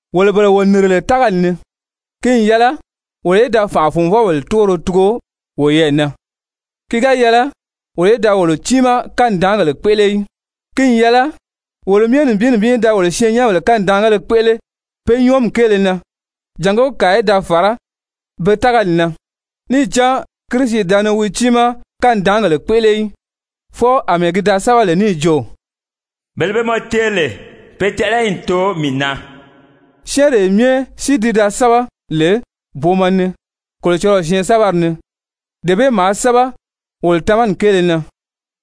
Wolo bele wo nìri lè tágali ni, ki n yɛlɛ wolo í da fànʔa-fùnvɔbèle túgoro tugu woyɛɛ na, ki ga yɛlɛ wolo í da wolo tiimaa kanidaangèle kpéʔele í. Ki n yɛlɛ wolo myɛ nibin nibin í da wolo syɛɛnnyɛnbèle kanidaangéle kpéʔele pe nyɔɔmi kéele na jàngó kàa í da fàrá be tágali na. Níì cán Kirisi da ni wi tiimaa kanidaangèle kpéʔele í, fwɔɔ àmɛɛ ki da sɛ́bɛ lè níì jo: «Bele be mɔ teeri lè, pe tɛʔɛlɛyi n too mii na.» Syɛ́ɛnree myɛ si ti da sɛ́bɛ lè booma ni Kolocɔlɔɔ syɛɛnsɛbɛri ni, dee bee maa sɛ́bɛ wolo tamani kéele na,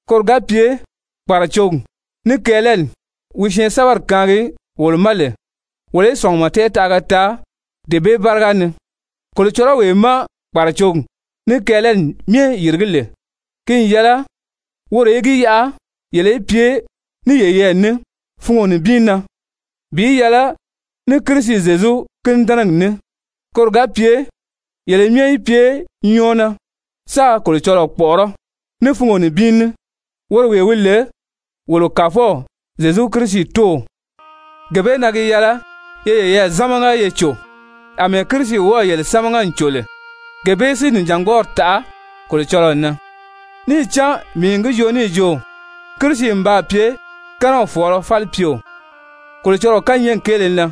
koro ga pye kpàracogi ní kɛɛlɛli wi syɛɛnsɛbɛri kaangi wolo ma lè, wolo í sɔ̀ngumɔ tɛɛtaʔaga taa dee bee báriga ni. Kolocɔlɔwee má kpàracogi ní kɛɛlɛli myɛ yìrigí lè, ki n yɛlɛ woro í gi yaʔa yele í pye ní yeyɛɛ ní fungo nibin na bi yɛlɛ ní Kirisi Zyezu kínidɛnɛgi ní, koro ga pye yele myɛ í pye nyɔɔ na sáā Kolocɔlɔɔ kpɔ̀ʔɔrɔ́ ní fungo nibin ní, woro wee wi lè wolo Kàfɔw Zyezu Kirisi Tóow. Gee bee na gi yɛlɛ ye yeyɛɛ zámaga ye cò àmɛɛ Kirisi wɔ́ɔ̀ yele sámaga n cò lè gee bee si nìjangbɔɔri taʔa Kolocɔlɔɔ na. Níì cán mii n gi joo níì jo Kirisi n baa pye kɛ́nɛw fɔ̀ɔlɔ falipyeo Kolocɔlɔɔ kányɛɛgi kéele na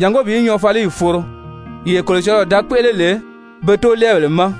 jàngó bi nyɔɔfaliyi foro yee Kolocɔlɔɔ da kpéʔele lè be toolɛɛbèle ma,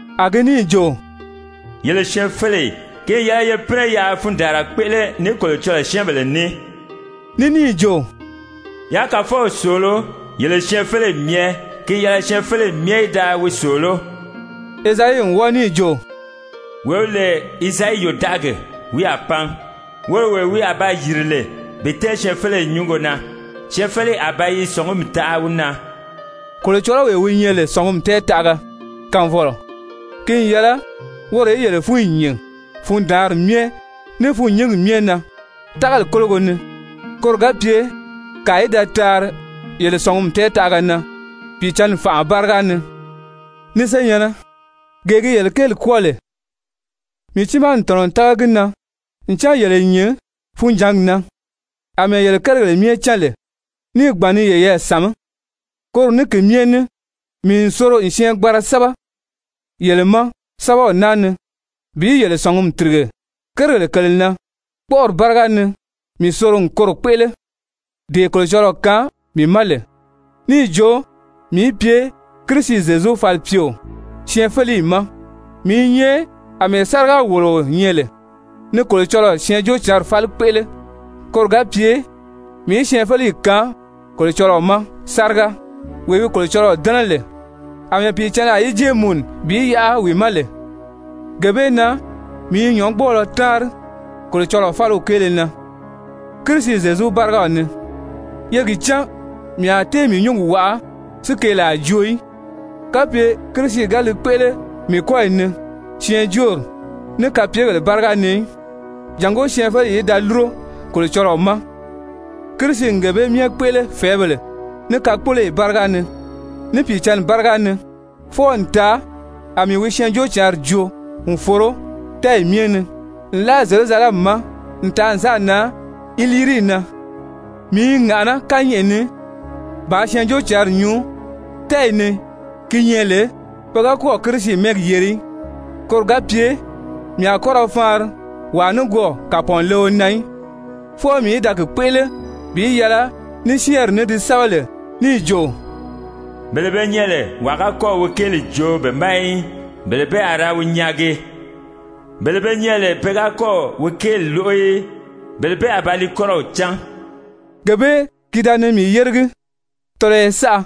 A gi níì jo: «Yele syɛɛnfeleyi, ki n yɛlɛ ye pínɛ yaa fundaanra kpéʔele ní Kolocɔlɔɔ syɛ́ɛnbèle ní.» Ní níì jo: «Yaa Kàfɔw sòoló, yele syɛɛnfeleyi myɛ, ki n yɛlɛ syɛɛnfeleyi myɛ í da wi sòoló.» Ezayi n wɔ́ɔ níì jo: «Wee wi lè Izayi yòdaʔagi, wi a pan, woro wee wi a ba yìri lè bi tɛ́ɛn syɛɛnfeleyi nyúngo na. Syɛɛnfeleyi a ba yi sɔ̀ngumi taʔa wi na.» Kolocɔlɔwee wi nyɛ lè sɔ̀ngumi tɛɛtaʔaga kaanfɔlɔ, ki n yɛlɛ woro í yele fúnyi nyìn fundaanri myɛ ní fûnnyingi myɛ na tágali kólogo ni, koro ga pye kàa í da taari yele sɔ̀ngumi taʔala na Pìicǎnni fànʔa báriga ni. Ni senyɛ̀nnɛ, gee gi yele kéeli kwɔ́ɔ lè, mii tiimaa n tɔ̀nɔ n tága gi na ncan yele n nyìn funjǎngi na, àmɛɛ yele kérigèle myɛ cán lè níì gbàn ni yeyɛɛ sàmí. Koro ní ki myɛ ní mii n soro n syɛɛngbanra sɛ́bɛ yele ma sɛ́bɛw naa ni bi yele sɔ̀ngumi tìrige kérigèle kèle na, kpɔ́ʔɔri báriga ni mii soro n koro kpéʔele, dee Kolocɔlɔɔ kaan mii ma lè, níì jo mii í pye Kirisi Zyezu falipyeo syɛɛnfeleyi ma. Mii i nyɛ àmɛɛ sáriga-wòloo nyɛ lè ni Kolocɔlɔɔ Syɛɛnjóocǎnri fáli kpéʔele, koro ga pye mii í syɛɛnfeleyi kaan Kolocɔlɔɔ ma sáriga, wee wi Kolocɔlɔɔ dɛ́nɛ lè, àmɛɛ Pìicǎnni a yi jée mùnu bi yaʔa wi ma lè. Gee bee na mii i nyɔ̌ngbɔɔlɔ táanri Kolocɔlɔɔ fáliw kéele na Kirisi Zyezu bárigaw ni. Ye gi cán mii a tée mii nyúngi waʔa si keelaa joo í, kapye Kirisi ga li kpéʔele mii kɔ́yi ni syɛɛnjóori, ní kapyegèle báriga ni í, jàngó syɛɛnfeleyi í da lúro Kolocɔlɔɔ ma. Kirisi n gee bee myɛ kpéʔele fɛ̀ɛ́bèle ní kakpoloyi báriga ni, ní Pìicǎnni báriga ni fwɔɔ n taa a mii wi Syɛɛnjóocǎnri joo n foro tɛ́ɛyi myɛ ni nlaa Zyerusalɛmi ma n taa n sáà nan Ilirii na. Mii i ŋàʔaná kányɛʔɛ ni bàā Syɛɛnjóocǎnri nyuu tɛ́ɛyi ni gi nyɛ lè pe ga kɔ́ɔ̀ Kirisi mɛ́ɛgi yeri í, koro ga pye mii a kɔ́ ra faanri wàa nikwɔɔ kàpɔɔnleo na í, fwɔɔ mii í da gi kpéʔele bi yɛlɛ ní syɛ́ɛnri ní di sɛ́bɛ lè níì jo: «Bele be nyɛ lè wàa ga kɔ́ɔ̀ wi kéeli joo be ma í, bele bee a ba ra nyaagi. Bele be nyɛ lè pe ga kɔ́ɔ̀ wi kéeli lóʔo í, bele bee a ba li kɔ́rɔw cán.» Gee bee ki da ni mii yéregi tɔlɔyɔ saʔa,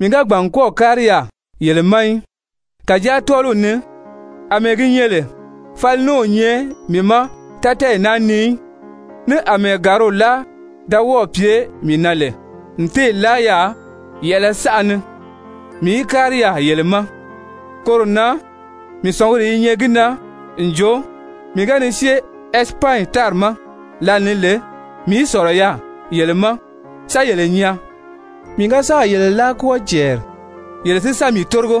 mii ga gbàn n kɔ́ɔ̀ kári yaà yele ma í. Kàjáa tɔ́ɔliw ni àmɛɛ gi nyɛ lè fali ní o nyɛ mii ma tátɛɛyi naa ni í, ní àmɛɛ gàriw láa da wɔ́ɔ̀ pye mii na lè n téè láa yaà yɛ̀ʔɛlɛ saʔa ni mii í kári yaà yele ma, koro na mii sɔ̀nguri i nyɛ gi na n jo, mii ga ni syée Ɛsipanyi tári ma lǎli ni lè, mii í sɔ̀lɔ yaà yele ma sa yele nyaa, mii ga sáà yele láa kwɔ́ɔ cɛɛri, yele si sa mii tórigo.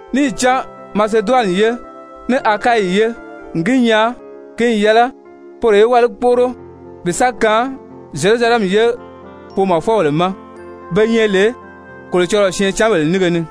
Níì cán Maseduwani ye ní Akayi ye n gi nyaa ki n yɛlɛ poro í wáli kpóʔoro bi sa kaan Zyerusalɛmi ye foomɔfɔbèle ma be nyɛ lè Kolocɔlɔɔ syɛɛncanbèle nínge ni.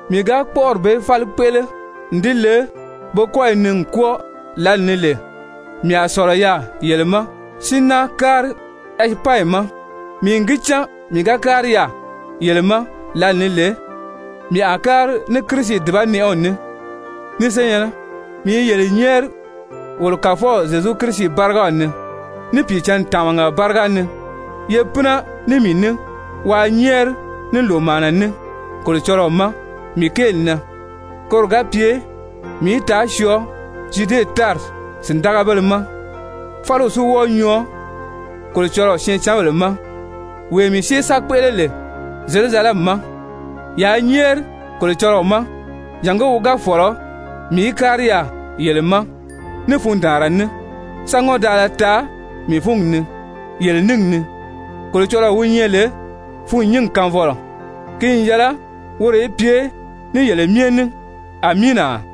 Mii ga kpɔ́ʔɔri bee fáli kpéʔele n di le be kɔ́yi ni n kwɔ́ɔ lǎli ni lè, mii a sɔ̀lɔ yaà yele ma si náa kári Ɛsipanyi ma. Mii n gi cán mii ga kári yaà yele ma lǎlee ni lè, mii a kári ní Kirisi dùbanɛʔɛw ní. Ni senyɛ̀nnɛ, mii i yele nyɛ́ɛri wolo Kàfɔw Zyezu Kirisi bárigaw ni ní Pìicǎnni tàmaga báriga ni, ye pínɛ ní mii ní waa nyɛ́ɛri ní lòmaana ní Kolocɔlɔɔ ma mii kéeli na, koro ga pye mii í taa syɔɔ Zyude tári sìndagabéle ma, fáliw si wɔ́ɔ nyɔɔ Kolocɔlɔɔ syɛɛncanbèle ma wee mii syée sa kpéʔele lè Zyerusalɛmi ma. Yaa nyɛ́ɛri Kolocɔlɔɔ ma jàngó wi ga fɔ̀lɔ, mii í kári yaà yele ma ní fundaanra ní, sa ŋɔ́ndaala taa mii fúngi ni yele níngi ni. Kolocɔlɔɔ wi nyɛ lè fûnnyingi kaanfɔlɔ, ki n yɛlɛ woro í pye ní yele myɛ ní! Amiina!